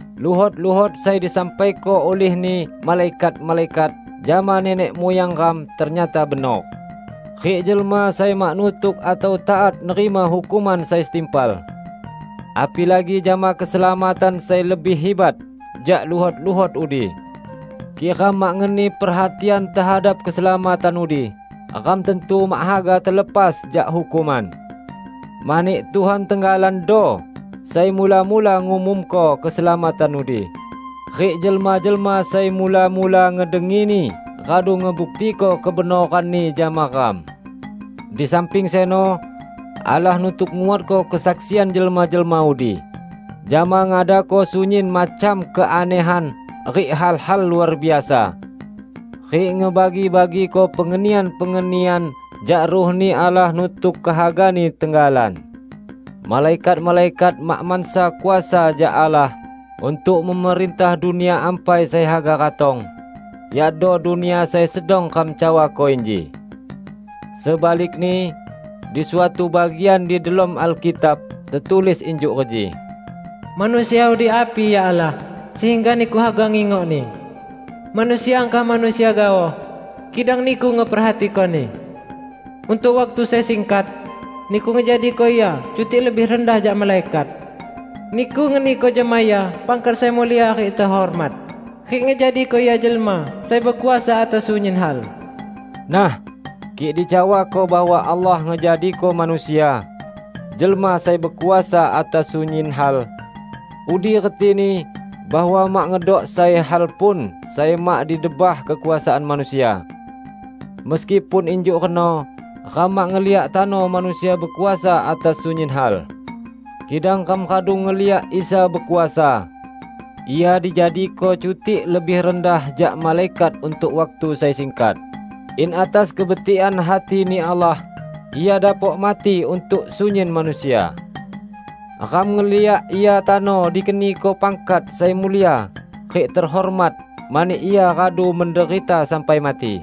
Luhot-luhot sai disampaiko ulihni malaikat-malaikat jama nenek muyang ram ternyata benor, rik jelma sai mak nutuk atau taat nerima hukuman sai setimpal. Apilagi jama keselamatan sai lebih hibat jak luhot-luhot udi! Kik ram mak ngeni perhatian tehadap keselamatan udi, ram tantu mak haga telepas jak hukuman. Mani Tuhan tenggalando sai mula-mula ngumumko keselamatan udi, rik jelma-jelma sai mula-mula ngedengini radu ngebuktiko kebenoranni jama ram. Di samping seno, Allah nutuk nguatko kesaksian jelma-jelma udi jama ngadako sunyin macam keanehan rik hal-hal luar biasa rik ngebagi-bagiko pengenian-pengenian jak Ruh-Ni Allah nutuk kehaga-Ni tenggalan. Malaikat-malaikat mak mansa kuasa jak Allah untuk memerintah dunia ampai sai haga ratong, yakdo dunia sai sedang ram cawako inji. Sebalikni, di suatu bagian di delom Alkitab tetulis injuk reji, "Manusia udi api, ya Allah, sehingga Niku haga ngingokni? Manusia angkah manusia gaoh, kidang Niku ngeperhatikoni! Untuk waktu sai singkat Niku ngejadiko ia cutik lebih rendah jak malaikat. Niku ngeniko jama ia pangkat sai mulia rik tehormat, rik ngejadiko ia jelma sai bekuasa atas sunyin hal." Nah, kik dicawako bahwa Allah ngejadiko manusia "jelma sai bekuasa atas sunyin hal", udi retini bahwa mak ngedok sai hal pun sai mak di debah kekuasaan manusia. Meskipun injuk reno, ram mak ngeliak tano manusia bekuasa atas sunyin hal. Kidang ram radu ngeliak Isa bekuasa! Ia dijadiko cutik lebih rendah jak malaikat untuk waktu sai singkat, in atas kebetikan hati-Ni Allah Ia dapok mati untuk sunyin manusia. Ram ngeliak Ia tano dikeniko pangkat sai mulia rik tehormat mani Ia radu menderita sampai mati.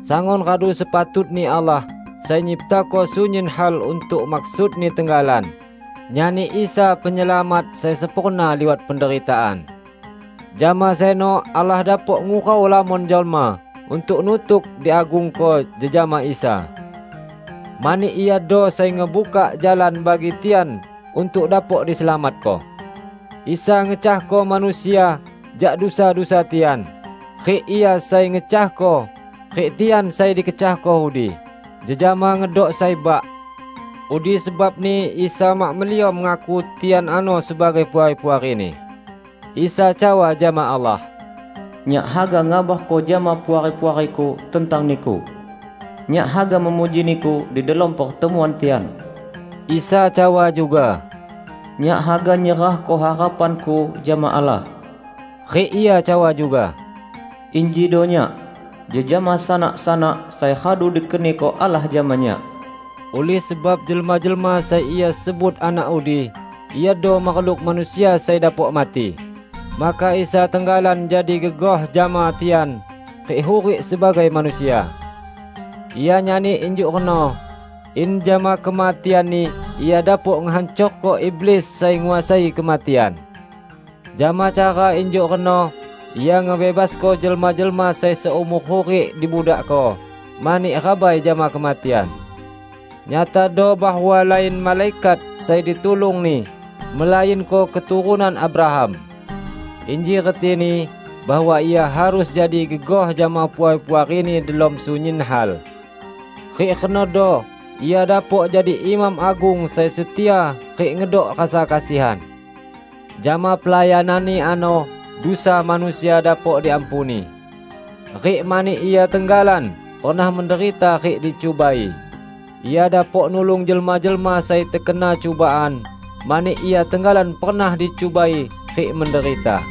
Sangun radu sepatutni Allah -- sai nyiptako sunyin hal untuk maksud-Ni tenggalan -- nyani Isa penyelamat sai sempurna liwat penderitaan. Jama seno Allah dapok ngurau lamon jelma untuk nutuk diagungko jejama Isa. Mani iado sai ngebukak jalan bagi tian untuk dapok diselamatko. Isa ngecahko manusia jak dusa-dusa tian; rik Ia sai ngecahko, rik tian sai dikecahko udi, jejama ngedok sai Bak. Udi sebabni Isa mak meliom ngaku tian ano sebagai puari-puari-Ni. Isa cawa jama Allah, "Nyak haga ngabarko jama puari-puari-Ku tentang Niku. Nyak haga memuji Niku di delom pertemuan tian." Isa cawa juga, "Nyak haga nyerahko harapan-Ku jama Allah." Rik Ia cawa juga, "Injido Nyak, jejama sanak-sanak sai radu dikeniko Allah jama Nyak." Ulih sebab jelma-jelma sai Ia sebut anak udi, iado makhluk manusia sai dapok mati, maka Isa tenggalan jadi gegoh jama tian rik hurik sebagai manusia. Ia nyani injuk reno, in jama kematian-Ni Ia dapok ngehancorko iblis sai nguasai kematian. Jama cara injuk reno Ia ngebebasko jelma-jelma sai seumor hurik dibudakko mani rabai jama kematian. Nyatado bahwa lain malaikat sai ditulung-Ni, melainko keturunan Abraham. Inji retini bahwa Ia harus jadi gegoh jama puari-puari-Ni delom sunyin hal. Rik renodo Ia dapok jadi Imam Agung sai setia rik ngedok rasa kesian. Jama pelayanan-Ni ano dusa manusia dapok diampuni. Rik mani Ia tenggalan pernah menderita rik dicubai, Ia dapok nulung jelma-jelma sai tekena cubaan, mani Ia tenggalan pernah dicubai rik menderita.